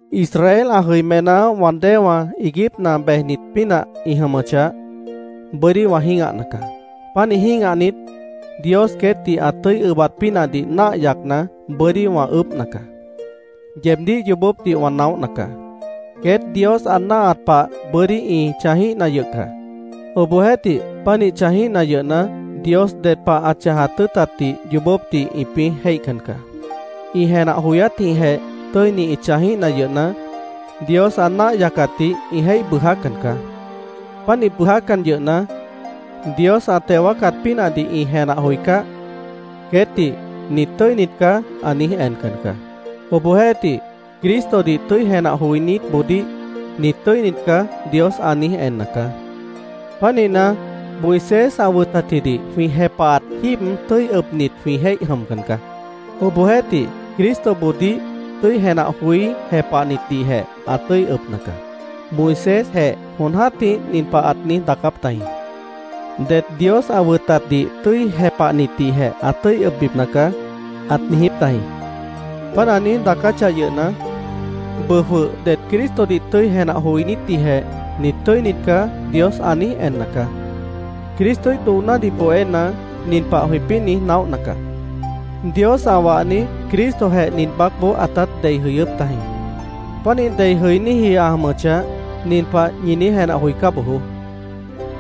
Israel ã jʉimená wã déewã iiguípna bejnit pínah ĩ jʉmʉchah, bʉ́dí wã jĩ́gahna caá. Pánih jĩ́gahnit, Dios queétdih ã tʉ́i ʉbat pínahdih náah yacna, bʉ́dí wã ʉʉ́bhna caá. Yeebdíh yoobópdih wã naóhna caá. Queét Dios ã náahat pah bʉ́dí ĩ chãjíhna yʉh caá. Obohjeéhtih, pánih chãjíhna yʉhna, Dios ded pah ã chãjat tʉ́ʉtatdih yoobópdih ĩpĩ́ jéihcan caá. Ĩ jenah joyátjĩhjeh tʉ́ini ĩ chãjíhna yʉhna, Dios ã náah yacatdih ĩ jéih bʉʉjácan caá. Pánih bʉʉjácan yʉhna, Dios ã teo wáacat pínahdih ĩ jenah joicáh, queétdih “Nit tʉ́init caá”, ã niíj encan caá. Obohjeéhtih, Cristodih tʉ́i jenah joinítboodíh “Nit tʉ́init caá”, Dios ã niíj enna caá. Pánihna, Moisés ã wʉtatjidih jwĩ jepahat jíib tʉ́i ʉbnit jwĩ jéih jʉmcan caá. Obohjeéhtih, Cristoboodíh tʉ́i jenah joí jepahnitdihjeh ã tʉ́i ʉbna caá. Moisésjeh jon jã́tih nin pah ãt niíj daacáp tajĩ: “Det Dios ã wʉtatdih tʉ́i jepahnitdihjeh ã tʉ́i ʉbbipna caá”, ãt niijíp tajĩ. Páant ã niíj daacáchah yʉhna, bʉʉ jwʉh det Cristodih tʉ́i jenah joinítdihjeh “Nit tʉ́init caá”, Dios ã niíj enna caá. Cristoíh doonádih bohéna, nin pah jwĩpĩ́ niíj naóhna caá: Dios ã wahni Cristojeh nin baácboó ãtát dei jʉyʉ́p tajĩ. Pánih dei jʉiníji ã jʉmʉchah, nin pah ñi niíj jenah joicá bojoó: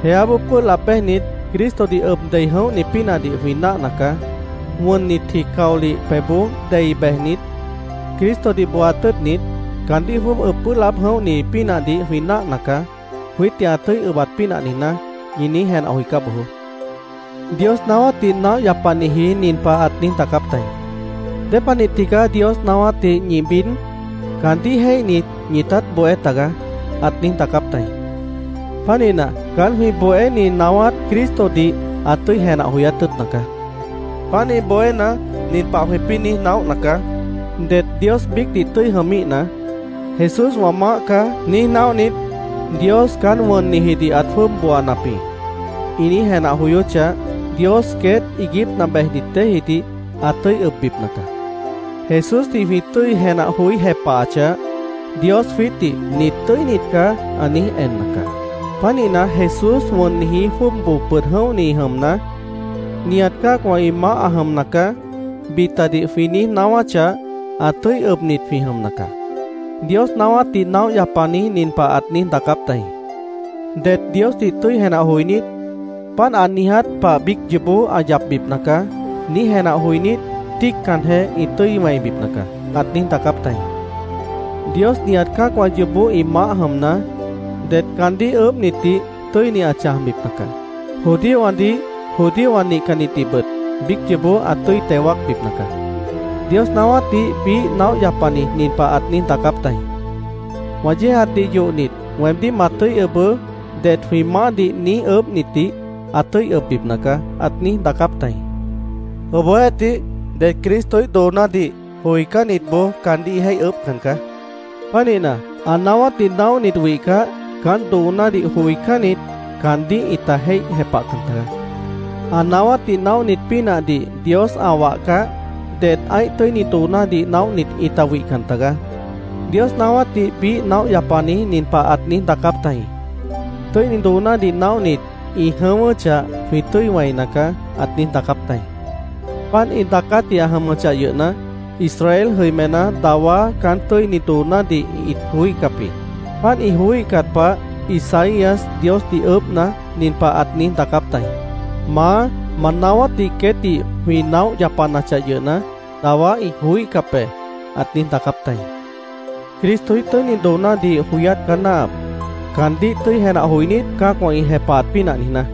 “Jeáboó pʉ́ʉh laab béjnit, Cristodih ʉb dei jʉ̃óhni pínahdih jwĩ náahna caá. Wʉnnitji caolih pebhboó dei bejnit, Cristodih booat tʉ́ʉtnit, caandíh jwʉ́ʉb ʉb pʉ́ʉh laáb jʉ̃óhni pínahdih jwĩ náahna caá, jwiítdih ã tʉ́i ʉbat pínah niijná”, ñi niíj jenah joicá bojoó. Dios naáwátdih naóh yapaniji nin pah ãt niíj daacáp tajĩ: “¿Dépanih tigaá Dios naáwátdih ñi bid? Caandíh jéihnit, ñitát bohé tagaá”, ãt niíj daacáp tajĩ. Pánihna, caán jwĩ bohéni naáwát Cristodih ã tʉ́i jenah joyát tʉ́ʉtna caá. Pánih bohéna, nin pah jwĩpĩ́ niíj naóhna caá: Det Dios biícdih tʉ́i jʉmíhna, “Jesús wã maáh caá”, niíj naóhnit, “Dios caán wʉnnijidih ãt jwʉ́ʉb booanap jĩ”, ĩ niíj jenah joyóchah, Dios queét iiguípna bejnit déejidih ã tʉ́i ʉbbipna caá. Jesúsdih jwĩ tʉ́i jenah joí jepahachah, Dios jwiítdih “Nit tʉ́init caá”, ã niíj enna caá. Pánihna, “Jesús wʉnniji jwʉ́ʉb boo pʉd jʉ̃óhni jʉmna, nihat cã́acwã ĩ maáh ã jʉmna caá”, bitadih jwĩ niíj naáwáchah, ã tʉ́i ʉbnit jwĩ jʉmna caá. Dios naáwátdih naóh yapani nin pah ãt niíj daacáp tajĩ: “Det Diosdih tʉ́i jenah joinít, ‘Páant ã niiját pah biíc yoobó ã yapbipna caá’, niíj jenah joinít, tíiccanjeh ĩ tʉ́i wẽibipna caá”, ãt niíj daacáp tajĩ. Dios nihat cã́acwã yoobó ĩ maáh jʉmna, det caandíh ʉʉ́bhnitdih tʉ́ini ã chãjbipna caá. Judíowãdih, judíowã nihcannitdihbʉt biíc yoobó ã tʉ́i teo wáacbipna caá. Dios naáwátdih biíh naóh yapani nin pah ãt niíj daacáp tajĩ: “ ‘Wã yéejatdih yohnit, weemdíh ma tʉ́i ʉbʉʉ́’, det jwĩ maáhdih niíj ʉʉ́bhnitdih ã tʉ́i ʉbbipna caá”, ãt niíj daacáp tajĩ. Obohjeéhtih, det Cristoíh doonádih joicánnitboó caandíh ĩ jéih ʉʉ́bhcan caá. Pánihna, ã naáwátdih naóhnit wihcah, caán doonádih joicánnit, caandíh ĩta jéih jepahcan tagaá. Ã naáwátdih naóhnit pínahdih Dios ã wahcah, det ã́ih tʉ́ini doonádih naóhnit ĩta wihcan tagaá. Dios naáwátdih biíh naóh yapani nin pah ãt niíj daacáp tajĩ: “Tʉ́ini doonádih naóhnit ĩ jʉ̃ʉ́wʉ́chah, jwĩ tʉ́i wẽina caá”, ãt niíj daacáp tajĩ. Páant ĩ daacátji ã jʉmʉchah yʉhna, Israel jʉimená dawá caán tʉ́ini doonádih ĩt joííhcap jĩ. Páant ĩ joííhcat pah Isaías Diosdih ʉʉ́bhna, nin pah ãt niíj daacáp tajĩ: “Maá, ma naáwátdih queétdih jwĩ naóh yapanachah yʉhna, dawá ĩ joííhcap be”, ãt niíj daacáp tajĩ. Cristoíh tʉ́ini doonádih joyát caá náahap, caandíh tʉ́i jenah joinít, cã́acwã ĩ jepahat pínah niijná.